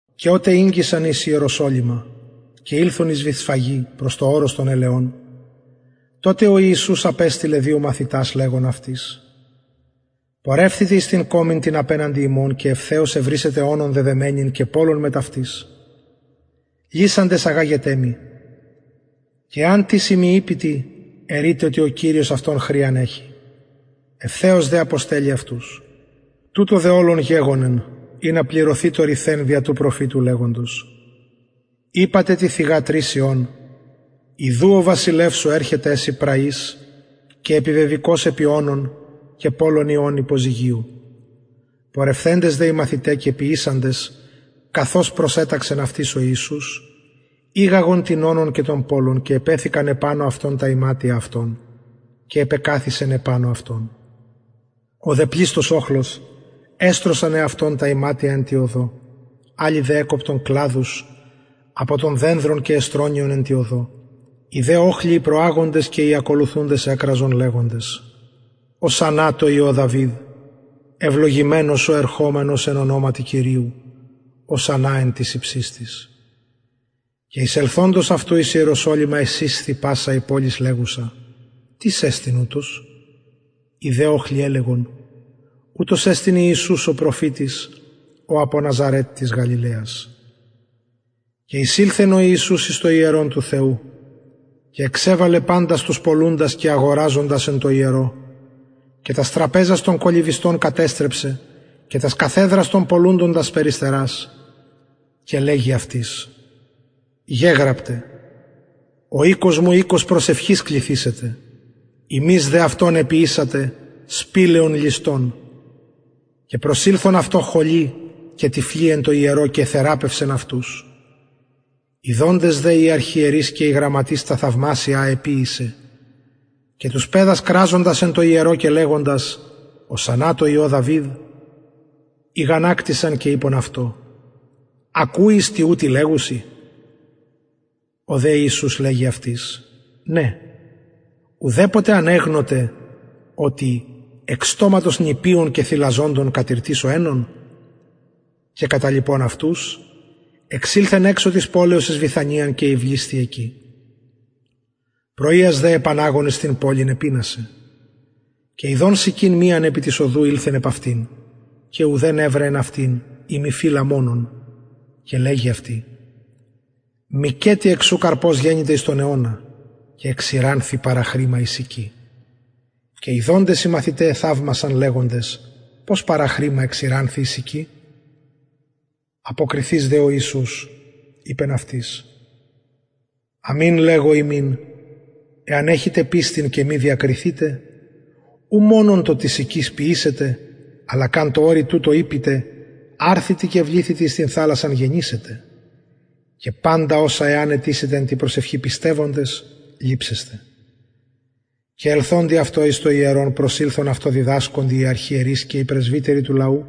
και οτε ηγγισαν εις ιεροσολυμα και ηλθον εις βηθσφαγη προς το ορος των ελαιων τοτε ο ιησους απεστειλεν δυο μαθητας λεγων αυτοις πορευθητε εις την κωμην την απεναντι υμων και ευθεως ευρησετε ονον δεδεμενην και πωλον μετ αυτης λυσαντες αγαγετε μοι και εαν τις υμιν ειπη τι ερειτε οτι ο κυριος αυτων χρειαν εχει ευθεως δε αποστελλει αυτους τουτο δε ολον γεγονεν ινα πληρωθη το ρηθεν δια του προφητου λεγοντος ειπατε τη θυγατρι σιων ιδου ο βασιλευς σου ερχεται σοι πραυς και επιβεβηκως επι ονον και πωλον υιον υποζυγιου πορευθεντες δε οι μαθηται και ποιησαντες καθως προσεταξεν αυτοις ο ιησους ηγαγον την ονον και τον πωλον και επεθηκαν επανω αυτων τα ιματια αυτων και επεκαθισεν επανω αυτων ο δε πλειστος οχλος εστρωσαν εαυτων τα ιματια εν τη οδω αλλοι δε εκοπτον κλαδους απο των δενδρων και εστρωννυον εν τη οδω οι δε οχλοι οι προαγοντες και οι ακολουθουντες εκραζον λεγοντες ωσαννα τω υιω δαυιδ ευλογημενος ο ερχομενος εν ονοματι κυριου ωσαννα εν τοις υψιστοις και εισελθοντος αυτου εις ιεροσολυμα εσεισθη πασα η πολις λεγουσα τις εστιν ουτος οι δε οχλοι ελεγον ουτος εστιν ιησους ο προφητης ο απο ναζαρετ της γαλιλαιας και εισηλθεν ο ιησους εις το ιερον του θεου και εξεβαλεν παντας τους πωλουντας και αγοραζοντας εν τω ιερω και τας τραπεζας των κολλυβιστων κατεστρεψεν και τας καθεδρας των πωλουντων τας περιστερας και λεγει αυτοις γεγραπται ο οικος μου οικος προσευχης κληθησεται υμεις δε αυτον εποιησατε σπηλαιον ληστων και προσηλθον αυτω χωλοι και τυφλοι εν τω ιερω και εθεραπευσεν αυτους ιδοντες δε οι αρχιερεις και οι γραμματεις τα θαυμασια α εποιησεν και τους παιδας κραζοντας εν τω ιερω και λεγοντας ωσαννα τω υιω δαυιδ ηγανακτησαν και ειπον αυτω ακουεις τι ουτοι λεγουσιν ο δε ιησους λεγει αυτοις ναι ουδεποτε ανεγνωτε οτι εκ στοματος νηπιων και θηλαζοντων κατηρτισω αινον και καταλιπων αυτους εξηλθεν εξω της πολεως εις βηθανιαν και ηυλισθη εκει πρωιας δε επαναγων εις την πολιν επεινασεν και ιδων συκην μιαν επι της οδου ηλθεν επ αυτην και ουδεν ευρεν εν αυτη ει μη φυλλα μονον και λεγει αυτη μηκετι εκ σου καρπος γενηται εις τον αιωνα και εξηρανθη παραχρημα η συκη και ιδοντες οι μαθηται εθαυμασαν λεγοντες πως παραχρημα εξηρανθη η συκη αποκριθεις δε ο ιησους ειπεν αυτοις αμην λεγω υμιν εαν εχητε πιστιν και μη διακριθητε ου μονον το της συκης ποιησετε αλλα καν τω ορει τουτω ειπητε αρθητι και βληθητι εις την θαλασσαν γενησεται και παντα οσα εαν αιτησητε εν τη προσευχη πιστευοντες ληψεσθε και ελθοντι αυτω εις το ιερον προσηλθον αυτω διδασκοντι οι αρχιερεις και οι πρεσβυτεροι του λαου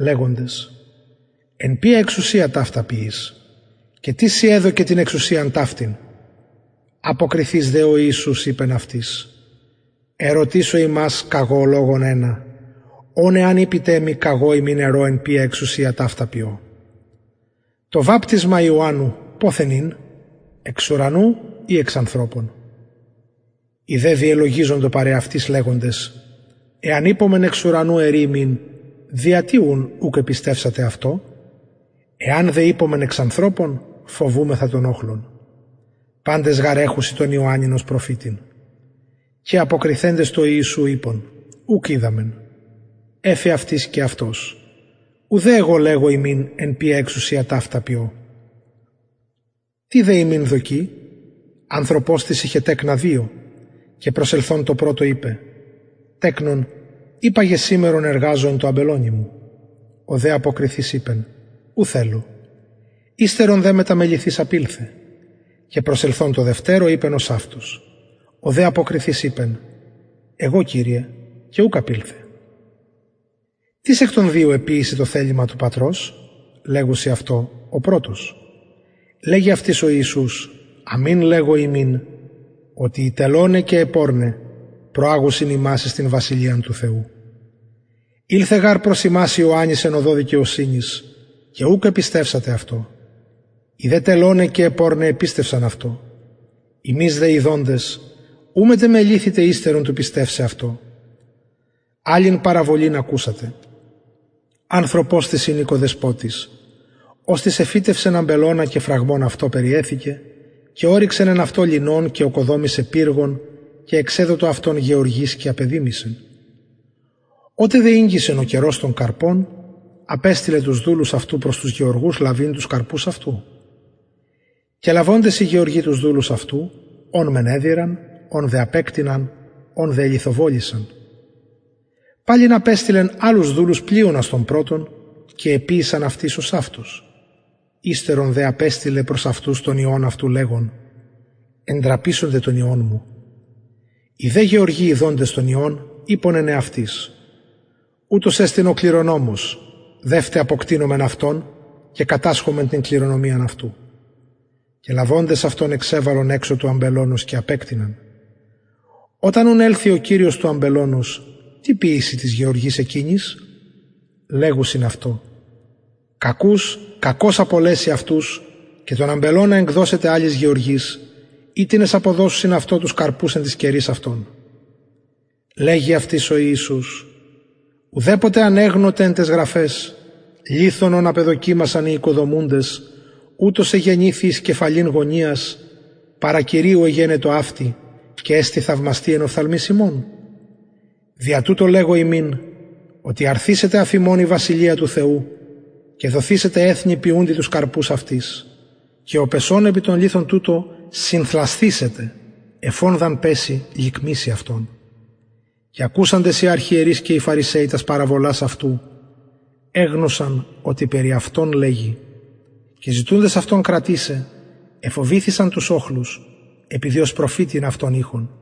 λεγοντες εν ποια εξουσια ταυτα ποιεις και τις σοι εδωκεν την εξουσιαν ταυτην αποκριθεις δε ο ιησους ειπεν αυτοις ερωτησω υμας καγω λογον ενα ον εαν ειπητε μοι καγω υμιν ερω εν ποια εξουσια ταυτα ποιω το βαπτισμα ιωαννου ποθεν ην εξ ουρανου η εξ ανθρωπων οι δε διελογιζοντο παρ εαυτοις λεγοντες εαν ειπωμεν εξ ουρανου ερει ημιν δια τι ουν ουκ επιστευσατε αυτω εαν δε ειπωμεν εξ ανθρωπων φοβουμεθα τον οχλον παντες γαρ εχουσιν τον ιωαννην ως προφητην και αποκριθεντες τω ιησου ειπον ουκ οιδαμεν εφη αυτοις και αυτος ουδε εγω λεγω υμιν εν ποια εξουσια ταυτα ποιω τι δε υμιν δοκει ανθρωπος ειχεν τεκνα δυο και προσελθων τω πρωτω ειπεν τεκνον υπαγε σημερον εργαζου εν τω αμπελωνι μου ο δε αποκριθεις ειπεν ου θελω υστερον δε μεταμεληθεις απηλθεν και προσελθων τω δευτερω ειπεν ωσαυτως ο δε αποκριθεις ειπεν εγω κυριε και ουκ απηλθεν τις εκ των δυο εποιησεν το θελημα του πατρος λεγουσιν αυτω ο πρωτος λεγει αυτοις ο ιησους αμην λεγω υμιν οτι οι τελωναι και αι πορναι προαγουσιν υμας εις την βασιλειαν του θεου ηλθεν γαρ προς υμας ιωαννης εν οδω δικαιοσυνης και ουκ επιστευσατε αυτω οι δε τελωναι και αι πορναι επιστευσαν αυτω υμεις δε ιδοντες ου μετεμεληθητε υστερον του πιστευσαι αυτω αλλην παραβολην ακουσατε ανθρωπος τις ην οικοδεσποτης οστις εφυτευσεν αμπελωνα και φραγμον αυτω περιεθηκεν και ωρυξεν εν αυτω ληνον και ωκοδομησεν πυργον και εξεδοτο αυτον γεωργοις και απεδημησεν οτε δε ηγγισεν ο καιρος των καρπων απεστειλεν τους δουλους αυτου προς τους γεωργους λαβειν τους καρπους αυτου και λαβοντες οι γεωργοι τους δουλους αυτου ον μεν εδειραν ον δε απεκτειναν ον δε ελιθοβολησαν παλιν απεστειλεν αλλους δουλους πλειονας των πρωτων και εποιησαν αυτοις ωσαυτως υστερον δε απεστειλεν προς αυτους τον υιον αυτου λεγων εντραπησονται τον υιον μου οι δε γεωργοι ιδοντες τον υιον ειπον εν εαυτοις ουτος εστιν ο κληρονομος δευτε αποκτεινωμεν αυτον και κατασχωμεν την κληρονομιαν αυτου και λαβοντες αυτον εξεβαλον εξω του αμπελωνος και απεκτειναν οταν ουν ελθη ο κυριος του αμπελωνος τι ποιησει τοις γεωργοις εκεινοις λεγουσιν αυτω κακους κακως απολεσει αυτους και τον αμπελωνα εκδωσεται αλλοις γεωργοις οιτινες αποδωσουσιν αυτω τους καρπους εν τοις καιροις αυτων λεγει αυτοις ο ιησους ουδεποτε ανεγνωτε εν ταις γραφαις λιθον ον απεδοκιμασαν οι οικοδομουντες ουτος εγενηθη εις κεφαλην γωνιας παρα κυριου εγενετο αυτη και εστιν θαυμαστη εν οφθαλμοις ημων δια τουτο λεγω υμιν οτι αρθησεται αφ υμων η βασιλεια του θεου και δοθησεται εθνει ποιουντι τους καρπους αυτης και ο πεσων επι τον λιθον τουτον συνθλασθησεται εφ ον δ αν πεση λικμησει αυτον και ακουσαντες οι αρχιερεις και οι φαρισαιοι τας παραβολας αυτου εγνωσαν οτι περι αυτων λεγει και ζητουντες αυτον κρατησαι εφοβηθησαν τους οχλους επειδη ως προφητην αυτον ειχον